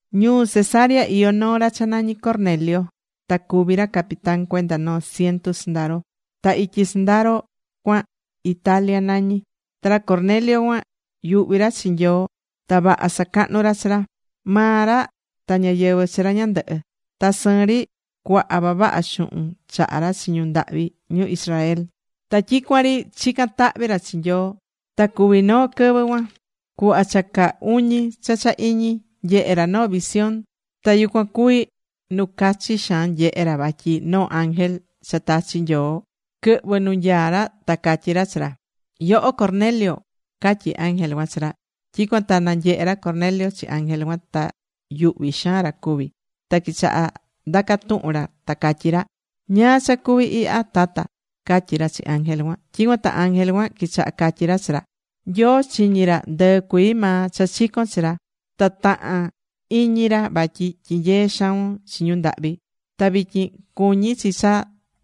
Ñuu Cesarea iyó noo ra cha nañí Cornelio. Ta cuví ra capitán cuenda noo ciento sɨndaro. Ta ityi sɨndaro cuan, Italia nañí. Ta ra Cornelio cuan yuhví ra chi Nyoo ta vaha sacahnú ra chi ra, maa ra ta ñáyɨvɨ chi ra ñandɨhɨ. Ta sɨɨn ri cuaha vavaha xuhun chahá ra chi ñu ndahvi ñu Israel. Ta tyicuan ri chicán tahvi ra chi Nyoo. Ta cuví noo quɨvɨ cuan cuhva cha caa uñi cha cha iñi, nyehe̱ ra noo visión. Ta yucuan cuvi̱ nu cachi xaan nyehe̱ ra vatyi noo ángel cha tachi̱ Nyoo quɨhvɨ̱ nu nyaá ra, ta catyí ra chi ra: ―¡Yoho Cornelio! ―catyi ángel cuan chi ra. Tyicuan ta nanyehe̱ ra Cornelio chi ángel cuan. Ta yuhvi xaan ra cuvi. Ta quichaha̱ ndaca tuhun ra ta catyí ra: ―¿Ñáá cha cuví ihya, Tata? ―catyí ra chi ángel cuan. Tyicuan ta ángel cuan quichaha catyi ra chi ra: ―Nyoo chiñi̱ ra ndɨɨ cuii maa cha chicón chi ra. Ta tahán iñi ra vatyi tyinyeé xaun chi ñu ndahvi. Ta vityin cuñí chi cha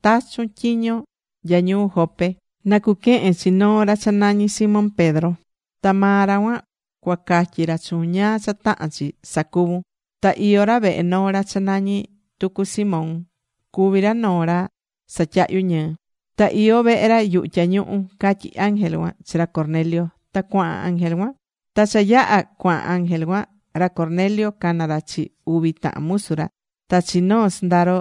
tachun tyiño nya ñuu Jope na cuquehen chi noo ra cha nañí Simón Pedro. Ta maa ra cuan cuacatyi ra chuun ñáá cha tahán chi sacuvun. Ta iyó ra vehe noo ra cha nañí tucu Simón, cuví ra noo ra satyahyú ñɨɨ. Ta iyó vehe ra yuhu tyañuhu ―catyí ángel cuan chi ra Cornelio, ta cuahan ángel cuan. Ta cha yaha̱ cuahan ángel cuan, ra Cornelio cana̱ ra chi uvi tahan musu ra, ta chi noo sɨndaro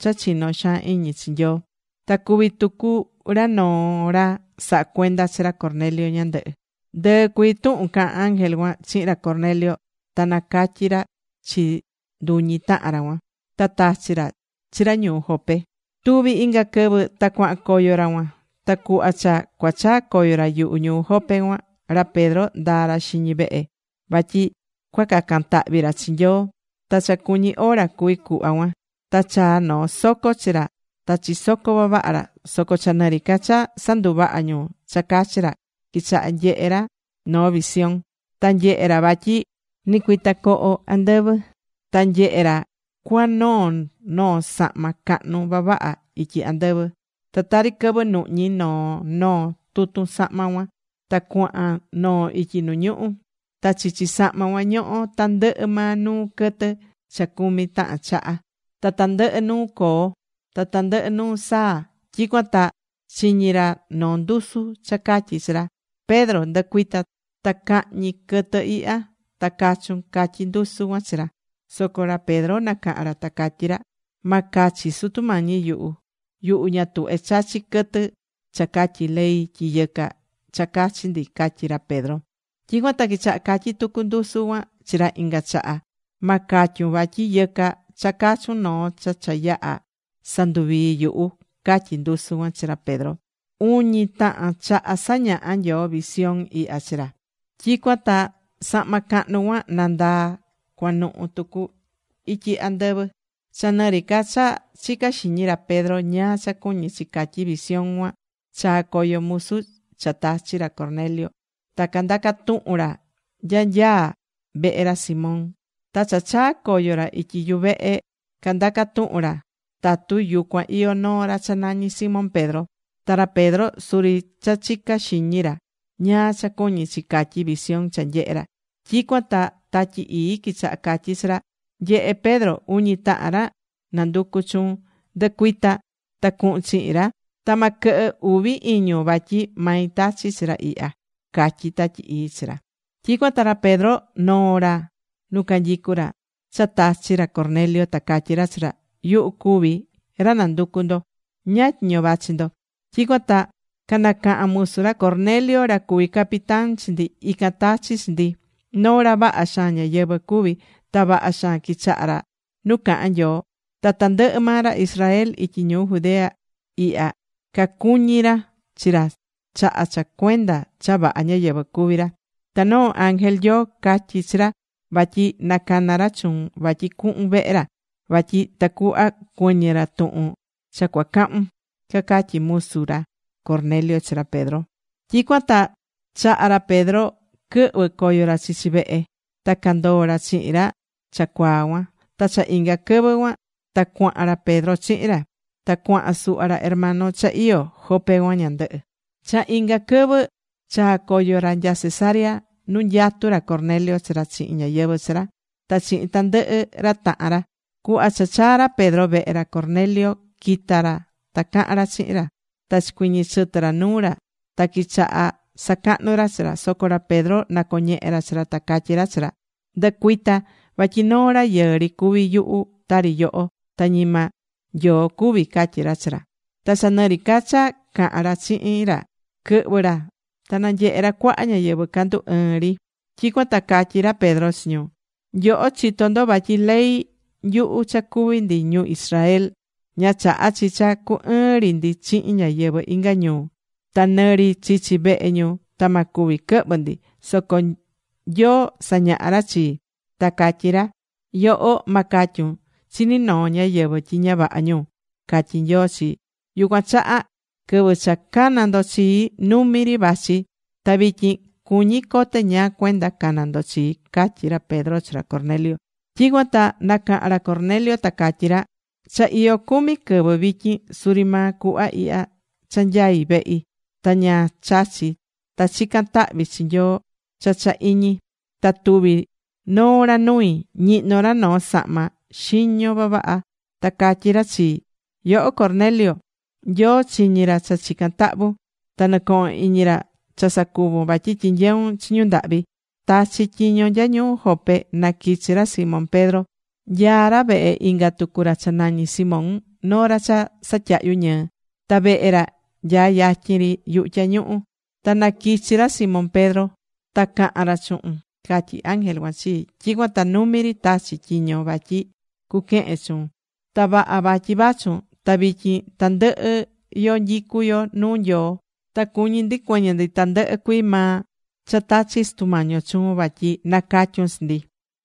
cha chinó xaan iñi chi Nyoo. Ta cuví tucu ra noo ra sahá cuenda chi ra Cornelio ñandɨhɨ. Ndɨɨ cuii tuhun caha̱n ángel cuan chihin ra Cornelio ta nacatyi̱ ra chi nduñi tahan ra cuan. Ta tachi̱ ra chi ra ñuu Jope. Tuvi̱ inga quɨvɨ ta cuahan coyo ra cuan. Ta cuhva cha cuachaa coyo ra yuhu ñuu Jope cuan, ra Pedro ndaa̱ ra xiñi vehe vatyi cuacacan tahvi ra chi Nyoo, ta cha cuñí hora cuví cuhva cuan. Ta chaa̱ noo soco chi ra ta chisocó vavaha ra. Soco cha nɨri ca cha sanduvahá ñu cha cachi ra, quichaha̱ nyehe ra noo visión. Ta nyehe̱ ra vatyi nɨcuitacoho andɨvɨ. Ta nyehe ra cua noo̱ noo sahma cahnu vavaha ityi andɨvɨ. Ta tari quɨvɨ nuhñi noo noo tutun sahma cuan ta cuahan noo ityi nu ñuhu. Ta chichi sahma cuan ñohó tandɨhɨ maa nuu quɨtɨ cha cumi tahan chaha. Ta tandɨhɨ nuu coo, ta tandɨhɨ nuu saa. Tyicuan ta chiñi̱ ra noo ndusu cha catyí chi ra: ―Pedro, ndɨ̱cuita ta ca̱hñi quɨtɨ ihya, ta ca̱chun ―catyí ndusu cuan chi ra. Soco ra Pedro nacaha̱n ra ta catyí ra: ―Ma cachi, Sutu Mañi yuhu. Yuhu ña tuhvé chachi quɨtɨ cha catyí ley tyi yɨca cha cachi ndi ―catyí ra Pedro. Tyicuan ta quichaha catyi tucu ndusu cuan chi ra inga chaha: ―Ma catyun vatyi yɨca cha cachun noo cha cha yaha̱ sanduvii̱ yuhu ―catyí ndusu cuan chi ra Pedro. Uñi tahan chaha sañaha̱ Nyoo visión ihya chi ra. Tyicuan ta sahma cahnu cuan nandaa̱ cuanuhu tucu ityi andɨvɨ. Cha nɨri ca cha chicá xiñi ra Pedro ñáá cha cuñí chi catyi visión cuan, chaa̱ coyo musu cha tachi̱ ra Cornelio. Ta candaca tuhun ra nya nyaá vehe ra Simón. Ta cha chaa coyo ra ityi yuvehe candaca̱ tuhun ra tatu yucuan iyó noo ra cha nañí Simón Pedro. Ta ra Pedro suri cha chicá xiñi ra ñáá cha cuñí chi catyi visión cha nyehe̱ ra. Tyicuan ta Tatyi Ii quichaha̱ catyi chi ra: ―Nye̱he Pedro, uñi tahan ra nanducú chuun. Ndɨ̱cuita ta cu̱hun chihin ra, ta ma quɨhɨ uvi iñun vatyi mai tachi̱ chi ra ihya ―catyí Tatyi Ii chi ra. Tyicuan ta ra Pedro noo̱ ra nu canyicu ra cha tachi̱ ra Cornelio, ta catyí ra chi ra: ―Yuhu cuví ra nanducú ndo. ¿Ñáá tyiño vachi ndo? Tyicuan ta canacaha̱n musu ra Cornelio ta catyí ra: ―Ra Cornelio, ra cuví capitán chi ndi ican tachi̱ chi ndi. Noo ra vaha xaan ñáyɨvɨ cuví. Ta vaha xaan quichahá ra nu cahán Nyoo. Ta tandɨhɨ maa ra Israel ityi Judea ihya cacuñí ra chi ra chaha cha cuenda cha vaha ñáyɨvɨ cuví ra. Ta noo ángel Nyoo catyi̱ chi ra vatyi na cana ra chuun, vatyi cuhun vehe ra vatyi tacuhva cuɨñɨ ra tuhun cha cuacahun ―cacatyí musu ra Cornelio chi ra Pedro. Tyicuan ta chaha̱ ra Pedro quɨhvɨ coyo ra chichi vehe. Ta candoo̱ ra chihin ra cha cuaa cuan. Ta cha inga quɨvɨ cuan ta cuahan ra Pedro chihin ra. Ta cuahan suhva ra hermano cha iyó Jope cuan ñandɨhɨ. Cha inga quɨvɨ chaa̱ coyo ra nya Cesarea nu nyatú ra Cornelio chi ra chihin ñáyɨvɨ chi ra, ta chihin tandɨhɨ ra tahan ra. Cuhva cha chaa̱ ra Pedro vehe ra, ra Cornelio quita̱ ra ta cahan ra chihin ra. Ta chicuiñi̱ chɨtɨ ra nuu ra ta quichaha sacahnu ra chi ra. Soco ra Pedro nacoñehe̱ ra chi ra, ta catyí ra chi ra: ―Ndɨ̱cuita vatyi noo rayɨɨ ri cuví yuhu tari yoho, ta ñima Nyoo cuví ―catyí ra chi ra. Ta cha nɨri ca cha cahán ra chihin ra, quɨhvɨ̱ ra ta nanyehe ra cuaha ñáyɨvɨ candu ɨɨn ri. Tyicuan ta catyí ra Pedro chi ñu: ―Nyoho chitó ndo vatyi ley nyuhu cha cuví ndi ñu Israel, ña chahá chi cha cu ɨɨn ri ndi chihin ñáyɨvɨ inga ñuu. Ta nɨ ri chichi vehe ñu ta ma cuvi quɨhvɨ ndi. Soco Nyoo sañaha̱ ra chii, ta catyí ra: “Yoho, ma catyun chi ni noo ñáyɨvɨ tyi ña vaha ñu”, catyí Nyoo chii. Yucuan chaha quɨvɨ cha cana̱ ndo chii, numi ri vachi. Ta vityin cuñí cote ñáá cuenda cana̱ ndo chii ―catyí ra Pedro chi ra Cornelio. Tyicuan ta nacaha̱n ra Cornelio, ta catyí ra: ―Cha iyó cumi quɨvɨ vityin, suri maa cuhva ihya cha nyaí vehi ta ña chachi̱ ta chicán tahvi chi Nyoo cha cha iñi. Ta tuvi̱ noo ra nui. Ñihnó ra noo sahma xiño vavaha. Ta catyí ra chii: “Yoho Cornelio, Nyoo chiñí ra cha chicán tahvun. Ta nɨcohón iñi ra cha sacuvún vatyi tyinyeún chi ñu ndahvi. Ta̱chi tyiño nya ñuu Jope na quichi ra Simón Pedro. Nyaá ra vehe inga tucu ra cha nañí Simón, noo ra cha satyahyu ñɨɨ. Ta vehe ra nyaá yatyin ri yuhu tyañuhu. Ta na quichi ra Simón Pedro ta cahan ra chuhun”, catyí ángel cuan chii. Tyicuan ta numi ri tachi̱ tyiño vatyi cuquehen chuun. Ta vaha vatyi vachun. Ta vityin tandɨhɨ yo nyicú yo nuu Nyoo. Ta cuñí ndi cuɨñɨ ndi tandɨhɨ cuii maa cha tachi̱ Sutu Mañi yo chuun vatyi nacatyun chi ndi.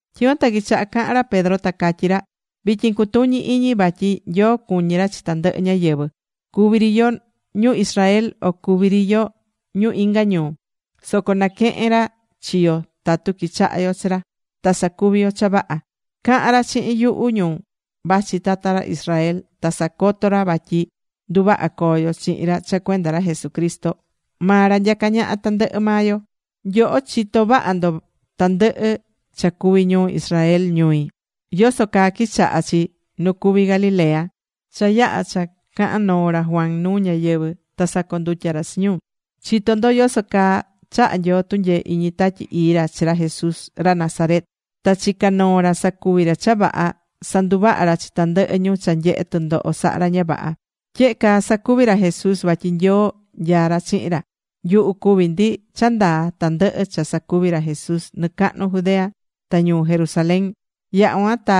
Tyicuan ta quichaha cahan ra Pedro ta catyí ra: ―Vityin cutuñi iñi vatyi Nyoo cuñí ra chi tandɨhɨ ñáyɨvɨ. Cuví ri yo ñu Israel, o cuví ri yo ñu inga ñuu. Soco naquehen ra chi yo tatu quichaha yo chi ra, ta sacuví yo cha vaha. Caha̱n ra chihin nyuhu ñu vachi tata ra Israel, ta sacoto̱ ra vatyi nduvaha coo yo chihin ra cha cuenda ra Jesucristo. Maa ra nyacá ñaha tandɨhɨ maa yo. Nyoho chitó vaha ndo tandɨhɨ cha cuvi̱ ñuu Israel ñui, yoso caa quichaha̱ chi nu cuví Galilea cha yaha̱ cha caha̱n noo ra Juan nuu ñáyɨvɨ, ta sacondutya̱ ra chi ñu. Chitó ndo yoso caa chaha̱ Nyoo tunyee iñi Tatyi Ii ra chi ra Jesús, ra Nazaret. Ta chica̱ noo ra sacuvi̱ ra cha vaha, sanduvaha̱ ra chi tandɨhɨ ñu cha nyehé tɨndoho sahá ra ña vaha. Tyehe caa sacuví ra Jesús vatyi Nyoo nyaá ra chihin ra. Nyuhu cuví ndi cha ndaa tandɨhɨ cha sacuvi̱ ra Jesús nɨcahnu Judea ta ñuu Jerusalén. Yaha̱ cuan ta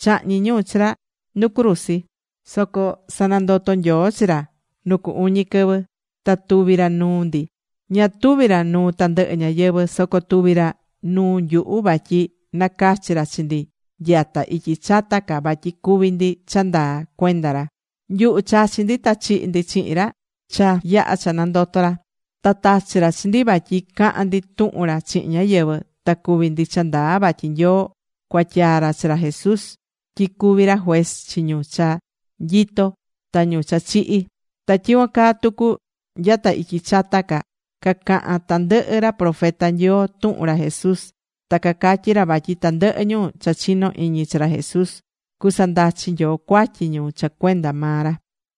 chahñi̱ ñu chi ra nu cruzi. Soco sanandoto̱ Nyoo chi ra nu cu uñi quɨvɨ. Ta tuvi̱ ra nuu ndi. Ña tuvi̱ ra nuu tandɨhɨ ñáyɨvɨ. Soco tuvi̱ ra nuu nyuhu vatyi nacachi̱ ra chi ndi nyata ityi chata ca vatyi cuvi ndi cha ndaa cuenda ra. Nyuhu chachi̱ ndi ta chihi̱ ndi chihin ra cha yaha̱ cha nandoto̱ ra. Ta tachi̱ ra chi ndi vatyi cahan ndi tuhun ra chihin ñáyɨvɨ. Ta cuví ndi cha ndaa vatyi Nyoo cuatyaa̱ ra chi ra Jesús tyi cuvi ra juez chi ñu cha nyitó ta ñu cha chihi̱. Ta tyicuan caa tucu nyata ityi chata ca, cacaha̱n tandɨhɨ ra profeta Nyoo tuhun ra Jesús. Ta cacatyí ra vatyi tandɨhɨ ñu cha chinó iñi chi ra Jesús, cusandachi Nyoo cuatyi ñu cha cuenda maa ra.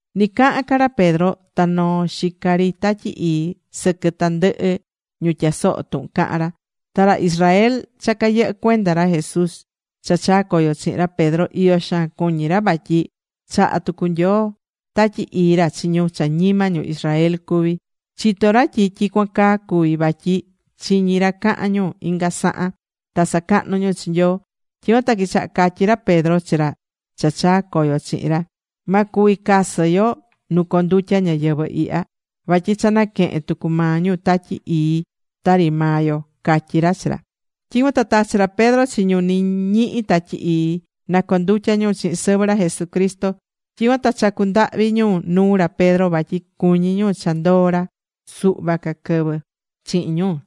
Ni cahán ca ra Pedro ta noo̱ xica ri Tatyi Ii sɨquɨ tandɨhɨ ñu tyasohó tuhun cahán ra. Ta ra Israel cha cayɨhɨ́ cuenda ra Jesús cha chaa̱ coyo chihin ra Pedro iyo xaan cuñí ra vatyi chaha̱ tucu Nyoo Tatyi Ii ra chi ñu cha ñima ñu Israel cuví. Chitó ra tyi tyicuan caa cuví vatyi chiñí ra cahán ñu inga sahan, ta sacahnú ñu chi Nyoo. Tyicuan ta quichaha̱ catyí ra Pedro chi ra cha chaa̱ coyo chihin ra: ―Ma cuvi casɨ yo nu condutya ñáyɨvɨ ihya. Vatyi cha naquehe̱n tucu maa ñu Tatyi Ii tari maa yo ―catyí ra chi ra. Tyicuan ta tachi̱ ra Pedro chi ñu nɨ ñihí Tatyi Ii na condutya ñu chihin sɨvɨ ra Jesucristo. Tyicuan ta chacu̱ ndahvi ñu nuu ra Pedro vatyi cuñí ñu cha ndoo ra suhva quɨvɨ chihin ñu.